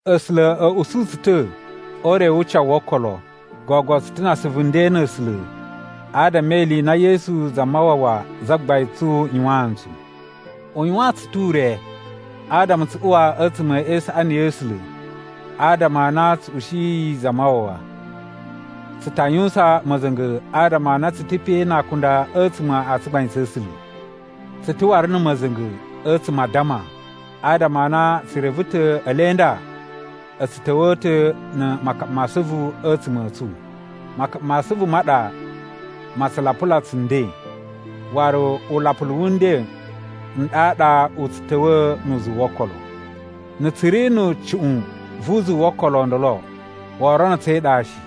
A̱sula̱ a̱ usu tsu ta̱ o ure wu ucawu wo okolo. Gogo tsu ta̱ na asuvu nden na̱ A̱sula̱ adama e ili i na Yesu Zamawawa Zagbain tsu yuwaan ntsu. U yuwaan tsu ta̱ ure adama tsu uwa a̱tsuma̱ e isaꞌani ya̱ A̱sula̱ adama a na tsu ushiyi Zamawawa. Tsu ta yuwusan ma̱za̱nga̱ adama a na tsu ta̱ pe na akunda a̱tsuma̱ a tsugbain tsa̱ A̱sula̱. Tsu ta̱ waru na̱ ma̱za̱nga̱ a̱tsuma̱ a addama, adama a na tsu reve ta̱ ele nda a̱ tsu ta̱wa̱a̱ ta̱ na̱ makaɓa ma asuvu a̱tsuma̱ a̱ tsu. Makaɓa ma asuvu ma ɗa ma tsu lapula tsu nden, waru ulapulu wu nden n ɗaɗa u tsu ta̱wa̱a̱ nu uzuwu wo okolo. Na̱ tsu ri na̱ cuꞌun vu uzuwu wo okolo o ndolo, woo rono tsu e iɗa shi.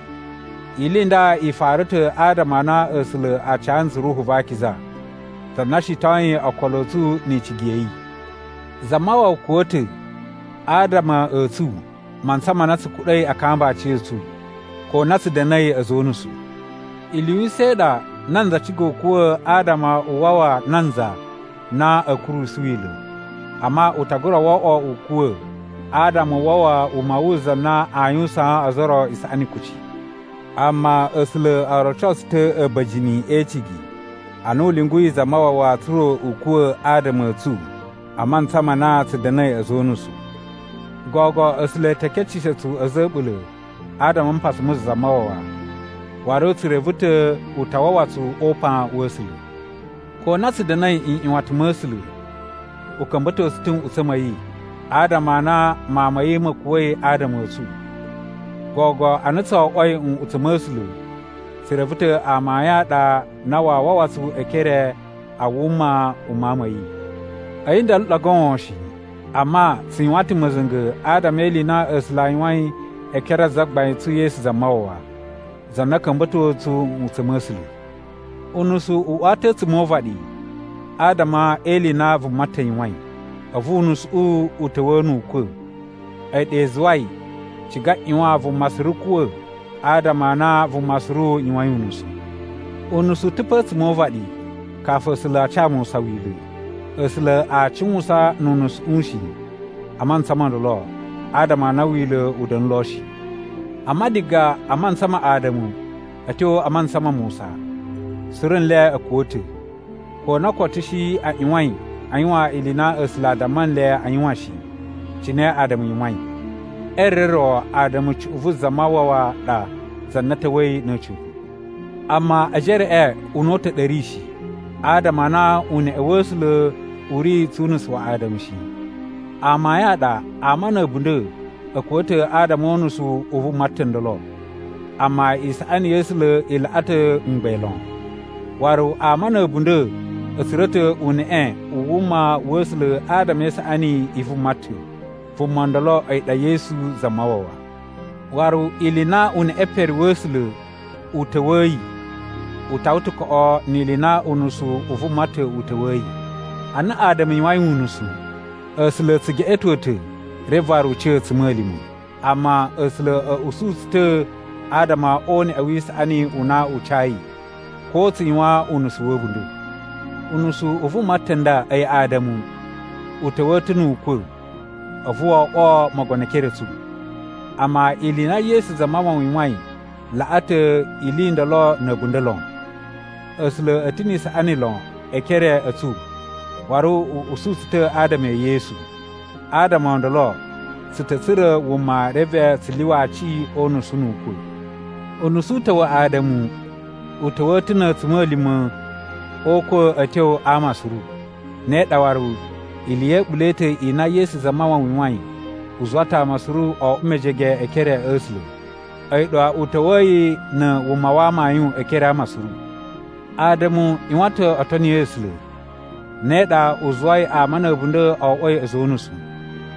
Ili i nda i fara ta̱ adama a na A̱sula̱ a ca ntsu Ruhu va Akiza, za na shitoyin okolo a̱ tsu ni icigi ya̱ yi. Zamawawa kuwa̱ ta̱ adama a̱ tsu mantsa ma na tsu kuɗa̱i a kamba aciya̱tsu, ko na tsu da̱na̱i a̱za̱ o unusu. Ili yu usa̱n i ɗa nanza ciga u kuwa̱ adama u wawa nanza na a̱a̱ kurusu Wila̱. Amma u ta gura oꞌwo u kuwa̱ adama u wawa wuma wu za na a yuwusaan ozo o ro isaꞌani kuci. Amma A̱sula̱ o roco tsu ta̱ a̱ba̱jini e icigi ana u lyunguyi Zamawawa tsa̱ra̱ u kuwa̱ adama a̱ tsu a mantsa ma na tsu da̱na̱i a̱za̱ o unusu. Gogo A̱sula̱ e te keceshe tsu a̱za̱ a̱ a̱ɓula̱ adama a mpasa mu Zamawawa, waru tsu reve ta̱ u ta wawa tsu o upan wa̱ A̱sula̱. Ko na tsu da̱na̱i nꞌyuwatan ma̱ A̱sula̱, u ka̱mba̱to tsu ta̱ nꞌutsa̱ ma̱ yi, adama a na Mawun ma̱ yi ma̱ kuwa̱i adama a̱ tsu. Gogo a na tso oꞌwoi nꞌutsa̱ ma̱ A̱sula̱, tsu reve ta̱ amayun a ɗa a na waa wawa tsu e ekere a wuma u Mawun ma̱ yi. A̱yi ndolo ɗa goon shi, amma tsu yuwan ta̱ ma̱za̱nga̱ adama e ili i na A̱sula̱ a yuwain e ekere a Zagbain tsu Yesu Zamawawa, za na ka̱mba̱to ntsu nꞌutsa̱ ma̱ A̱sula̱. Unusu u uwa ta̱ a̱tsuma̱ o uvaɗi adama e ili i na vuma ta̱ yuwain, a̱vu unusuꞌu u ta̱wa̱a̱ nu ukwa̱. A̱yi ɗa i zuwai ciga ꞌyuwan vuma suru kuwa̱ adama a na vuma suru yuwain unusu. Unusu u ta̱ pa a̱tsuma̱ o uvaɗi kafu A̱sula̱ a ca Musa Wila̱. A̱sula̱ aa cuwusan nu unusuꞌu shi a mantsa mo ndolo, adama a na Wila̱ u da̱na̱ lo shi. Amma diga a mantsa ma Ada̱mu a̱ tyo a mantsa ma Musa, suru nle a̱ kuwa̱ ta̱, ko na koto a̱ shi a ꞌyuwain a yuwan ili i na A̱sula̱ a damma nle a yuwan shi, cine Ada̱mu yuwain. E re ro Ada̱mu cuꞌun vu Zamawawa ɗa za na ta̱wa̱i na̱ a̱ca̱pa̱. Amma ejereꞌe una̱ta̱ u ɗa a̱ ri shi, adama a na uneꞌe wa̱ A̱sula̱ u ri tsu unusu wa Ada̱mu shi. Amayun a ɗa ama na̱ a̱bunda̱ a̱ kuwa̱ ta̱ adama o unusu u vuma ta̱ ndolo. Amma isaꞌani ya̱ A̱sula̱ i laꞌa ta̱ mgbain lon, waru ama na̱ a̱bunda̱ a̱ tsura̱ ta̱ uneꞌe u wuma wa̱ A̱sula̱ adama e isaꞌani i vuma ta̱. Vuma ndolo a̱yi ɗa Yesu Zamawawa. Waru ili i na uneꞌe pere wa̱ A̱sula̱ u ta̱wa̱yi u tawa ta̱ koꞌo ni ili i na unusu u vuma ta̱ u ta̱wa̱yi. Ana Ada̱mu yuwain unusu, A̱sula̱ a̱ tsu geꞌeto ta̱ reve waru u ca a̱tsuma̱lima̱. Amma A̱sula̱ a̱ usu tsu ta̱ adama o uneꞌe wi isaꞌani u na u cayi, ko tsu yuwan unusu wa̱ a̱bunda̱. Unusu u vuma ta̱ nda, a̱yi Ada̱mu, u ta̱wa̱a̱ ta̱ nu ukwa̱ a̱vu wo oꞌwo mogono e ekere a̱ tsu. Amma ili i na Yesu Zamawawa yuwain laꞌa ta̱ ili i ndolo na̱ a̱bunda̱ lon. A̱sula̱ a̱ ta̱ ni isaꞌani lon e ekere a̱ tsu, waru u usu tsu ta̱ adama e Yesu. Adama o ndolo tsu ta̱ tsura̱ wuma reve tsu lyuwa aci o unusu nu ukwa̱. Unusu u ta̱ wa Ada̱mu u ta̱wa̱a̱ ta̱ na̱ a̱tsuma̱lima̱ o ukwa̱ a̱ tyo a ama suru. Ne ɗa waru, ili ya̱ a̱ɓula̱ i ta̱ i na Yesu Zamawawa yuwain u zuwa ta̱ ama suru o oꞌwo mejege e ekere a̱ A̱sula̱. A̱yi ɗa u ta̱wa̱yi na̱ wuma wa amayun e ekere a ama suru. Ada̱mu ꞌyuwan ta̱ o toni A̱sula̱, ne ɗa u zuwai ama na̱ a̱bunda̱ o oꞌwoi a̱za̱ o unusu.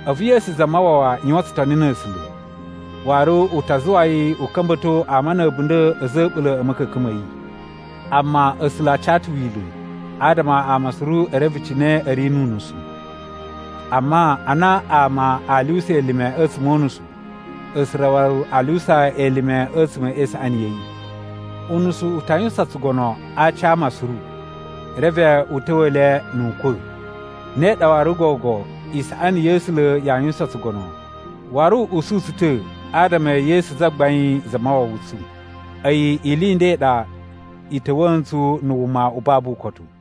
A̱vu Yesu Zamawawa yuwan tsutoni na̱ A̱sula̱, waru u ta zuwa yi u ka̱mba̱to ama na̱ a̱bunda̱ a̱za̱ a̱ a̱ɓula̱ a̱ ma̱ka̱ka̱n ma̱ yi. Amma A̱sula̱ a ca ta̱ Wila̱ adama ama suru e reve cine a̱ ri nu unusu. Amma a na ama a lyuwusa elime a̱tsuma̱ o unusu, A̱sula̱ waru a lyuwusa elime a̱tsuma̱ e isaꞌani ya̱ yi. Unusu u ta yuwusan tsugono a aci a ama suru, reve u ta̱wa̱a̱ le nu ukwa̱. Ne ɗa waru gogo, isaꞌani ya̱ A̱sula̱ yaa yuwusan tsugono, waru u usu tsu ta̱ adama e Yesu Zagbain Zamawawa tsu. A̱yi ili i nda i ɗa i ta̱wa̱a̱ ntsu na̱ wuma u babu ukotu.